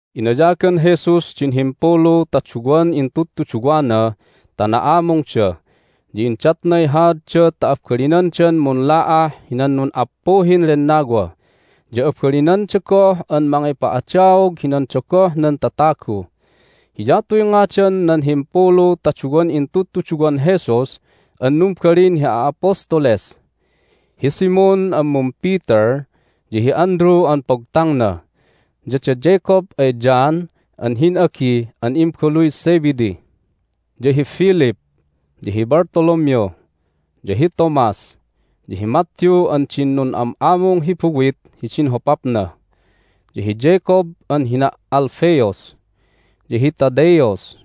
Inayagan Jesus din himpulu ta duwan intudtuduwana ta na'amungda. Ya indatnay haadda ta abalinandan munla'ah hinan nun'appuhin lennawa, ya abalinanda goh an mangipa'adaog hinan dogoh nan tatagu. Hiyatuy ngadan nan himpulu ta duwan intudtuduwan Jesus an numbalin hi a'apostoles: hi Simon an mum-Peter, ya hi Andrew an pogtangna, ya da Jacob ay John an hin'agi an imbabaluy Zebedee, ya hi Philip, ya hi Bartholomew, ya hi Thomas, ya hi Matthew an din nun'am'amung hi buwit hidin hopapna, ya hi Jacob an hina' Alphaeus, ya hi Thaddaeus,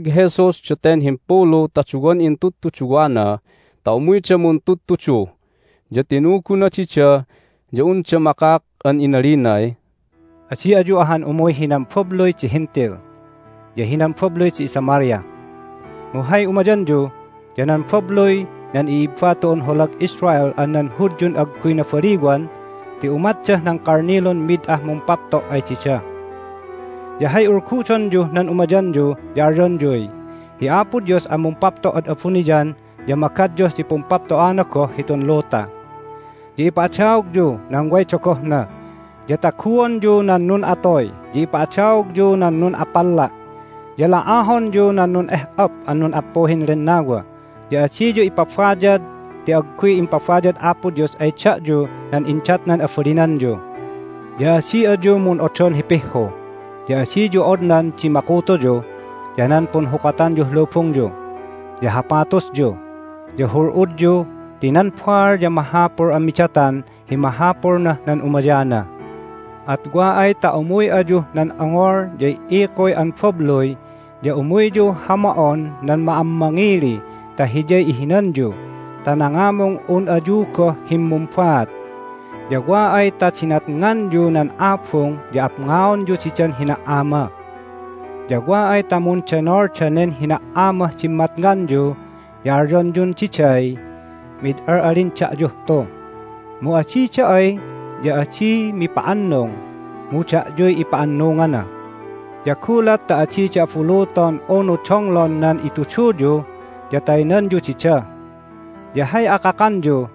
Hennag Jesus daten himpulu ta duwan intudtuduwana ta umuyda muntudtudu, ya tinuguna dida ya unda makak an inalinay, "Adi ayu ahan umuy hinan babluy di Hentil ya hinan babluy di iSamaria. Mu hay umayanyu ya nan babluy nan i'ibba tu'un holag Israel an nan Hudyun agguy nabaliwan ti umatdah nan kalnilun mid ah mumpapto' ay dida. Ya hay ulgudonyuh nan umayanyu ya alyonyuy, Hi Apo Dios an mumpapto' ad abuniyan ya magadyuh di pumpapto'ana goh hitun luta! Ya ipa'adaogyu nan way dogohna, ya taguonyu nan nun'atoy, ya ipa'adaogyu nan nun'apalla', ya la'ahonyu nan nun'eh'op an nun'appuhin lennawa. Ya adiyu ipabayad ti agguy impabayad Apo Dios ay da'yu nan indatnan abalinanyu. Ya adi ayu mun'odon hi pihhu, ya adiyu odnan di makutuyu, ya nan punhukatanyuh lubungyu, ya hapatusyu, ya hul'udyu ti nan baal ya mahapul an midatan hi mahapulnah nan umayana. At wa ay ta umuy ayuh nan ongol ya i"ikuy an babluy ya umuyyu hama'on nan ma'ammangili ta hiyay ihinanyu ta nangamung un ayu goh himmumbaat. Ya wa ay ta dinatnganyu nan abung ya apngaonyu didan hina"ama! Ya wa ay ta mundenol danen hina"amah dimmatnganyu ya alyonyun diday, Mid al'alin da'yuh tu! Mu adida ay ya adi mipa'annung, mu da'yuy ipa'annungana! Ya gulat ta adida abuluton unu donglon nan ituduyu ya taynanyu dida. Ya hay akakanyu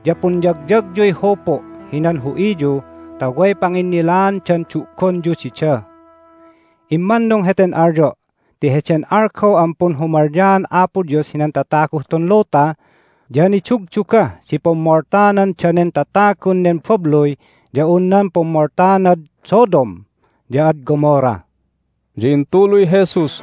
ya punyagyagyuy hupu' hinan hu'iyu ta way panginnilaandan du'gonyu dida. Immannung heten alyo' ti heden algaw an punhumalyaan Apo Dios hinan tataguh tun luta ya nidugdugah di pummoltanan danen tatagun nen babluy ya un nan pummoltanad Sodom ya ad Gomorrah." Hay Ipaligligatan nan Baal Jesus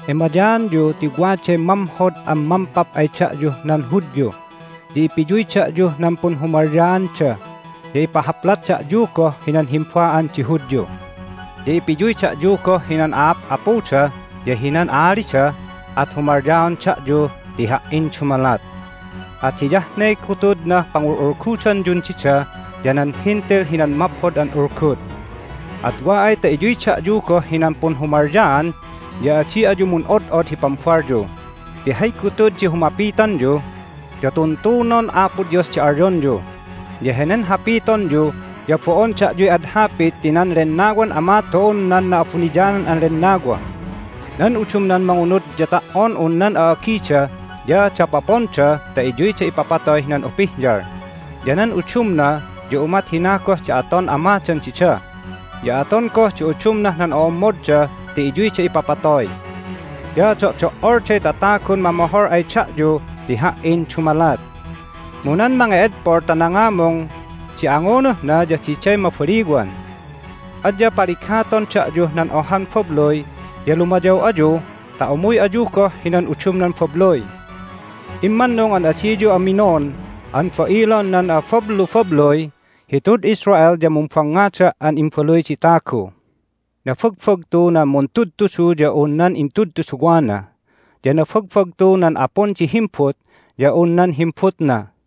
Emayaanyu ti waday mamhod an mampap ay da'yuh nan Hudyu, ya ipiyuy da'yuh nan punhumalyaanda, ya ipahaplat da'yu goh hinan himba'an di Hudyu. Ya ipiyuy da'yu goh hinan a'ap'apuda ya hinan a'alida, at humalyaon da'yu ti Ha"in dumalat. At hiyah ne gutudnah pangul'ulgudanyun dida ya nan Hentil hinan Maphod an Ulgud. At wa ay ta iyuy da'yu goh hinan punhumalyaan ya adi ayu mun'od'od hi pambalyu. Ti hay gutud di humapitanyu ya tuntunon Apo Dios di alyonyu. Ya henen hapitonyu ya bo'on da'yuy ad hapit ti nan Lennawan Ama tu'un nan Na'abuniyanan an Lennawa. Nan udumnan mangunud ya ta"on un nan a'agida ya dapoponda ta iyuyda ipapatoy hinan upihyal, ya nan udumna ya umat hina goh di aton amadan dida, ya aton goh di udumnah nan o'ommodda ti iyuyda ipapatoy. Ya do'do"olday tatagun mamohol ay da'yu ti Ha"in dumalat. Mu nan mange'edpol ta nangamung di angunuhna ya diday mabaliwan. Adya paligaton da'yuh nan ohan babluy ya lumayaw ayu ta umuy ayu goh hinan udumnan babluy. Immannung an adiyu aminon an ba'ilon nan abablubabluy hitud Israel ya mumbangngada' an Imbaluy di Tagu. Nabagbagtu nan muntudtudu ya un nan intudtuduwana, ya nabagbagtu nan apun di himbut ya un nan himbutna.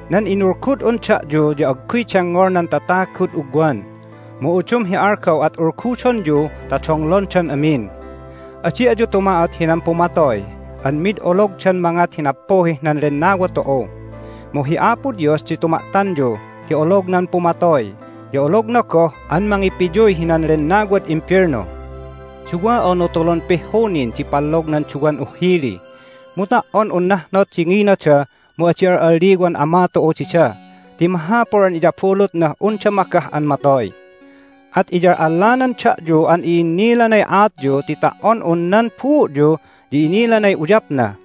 Nan inulgud'un da'yu ya agguy dengngol nan tatagud ugwan, mu udum hi algaw at ulgudonyu ta donglondan amin. Adi ayu tuma'ot hinan pumatoy an mid ologdan mangat hi nappuhih nan lennawa tu'u. Mu hi Apo Dios di tuma'tanyu ti olognan pumatoy, ya ologna goh an mangipiyuy hinan lennawad imbelnu. Duwa unu tulun pihhu nin di pallog nan duwan uhhili, mu ta"on un nahnot di nginada mu adi al'alliwan Ama tu'u dida ti mahapul an iyabulutnah unda magah an matoy. At iyal'allanan da'yu an i'innilanay aatyu ti ta"on un nan buu'yu ya inilanay uyapna.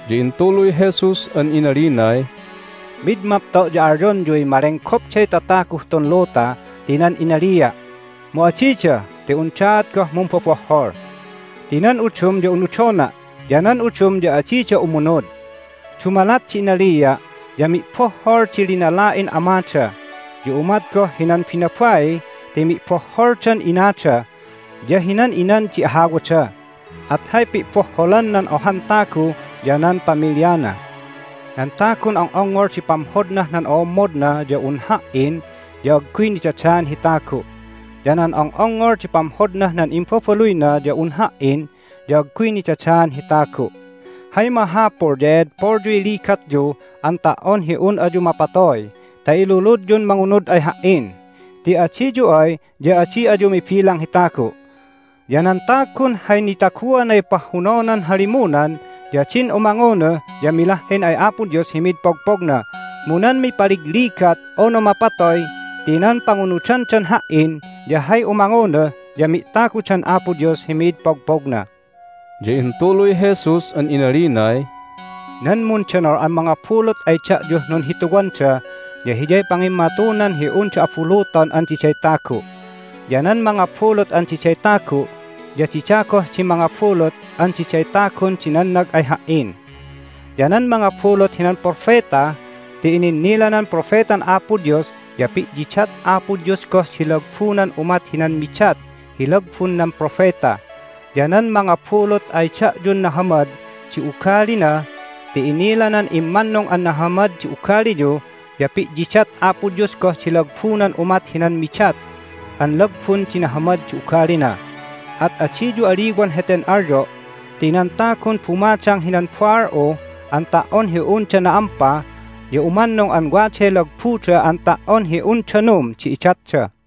Ya intuluy Jesus an inalinay, "Mid mapto' ya alyonyuy malenggopday tataguh tun luta ti nan inalia', mu adida ti undaat goh mumbobohhol. Ti nan udum ya unudona', ya nan udum ya adida umunud. Dumalat di inalia' ya mi'bohhol di linala'in amada, ya umat goh hinan binabai ti mi'bohholdan inada ya hinan inan di ahawada, at hay pi'bohholan nan ohan tagu ya nan pamilyana. Nan tagun ong'ongngol di pamhodnah nan o'ommodna ya un Ha"in ya agguy nidadaan hi tagu', ya nan ong'ongngol di pamhodnah nan imbabaluyna ya un Ha"in ya agguy nidadaan hi tagu'. Hay mahapul ya e'edpolyuy ligatyu an ta"on hi un ayu mapatoy ta iluludyun mangunud ay Ha"in, ti adiyu ay ya adi ayu mibilang hi tagu'. Ya nan tagun hay nitaguanay pahhunonan halimunan ya din umangunuh ya milahhin ay Apo Dios hi mid pogpogna. Mu nan mipaligligat unu mapatoy ti nan pangunudandan Ha"in ya hay umangunuh ya mi'tagudan Apo Dios hi mid pogpogna." Hay Aat di Lagbu Tu'ud Abuniyan Ya intuluy Jesus an inalinay, "Nan mundenol an mangabulut ay da'yuh nunhituwanda ya hiyay pangimmatunan hi unda abuluton an diday tagu'. Ya nan mangabulut an diday tagu' ya dida goh di mangabulut an diday tagun di nannag ay Ha"in. Ya nan mangabulut hinan propeta ti ininnilanan propetan Apo Dios ya pi'yidat Apo Dios goh di lagbunan umat hinan midat hi lagbun nan propeta. Ya nan mangabulut ay da'yun nahamad di ugalina ti inilanan immannung an nahamad di ugaliyu ya pi'yidat Apo Dios goh di lagbunan umat hinan midat an lagbun di nahamad di ugalina. At adiyu aliwan heten alyo' ti nan tagun bumadang hinan baal'u an ta"on hi unda na'ampa ya umannung an waday lagbuda an ta"on hi un danum di idatda."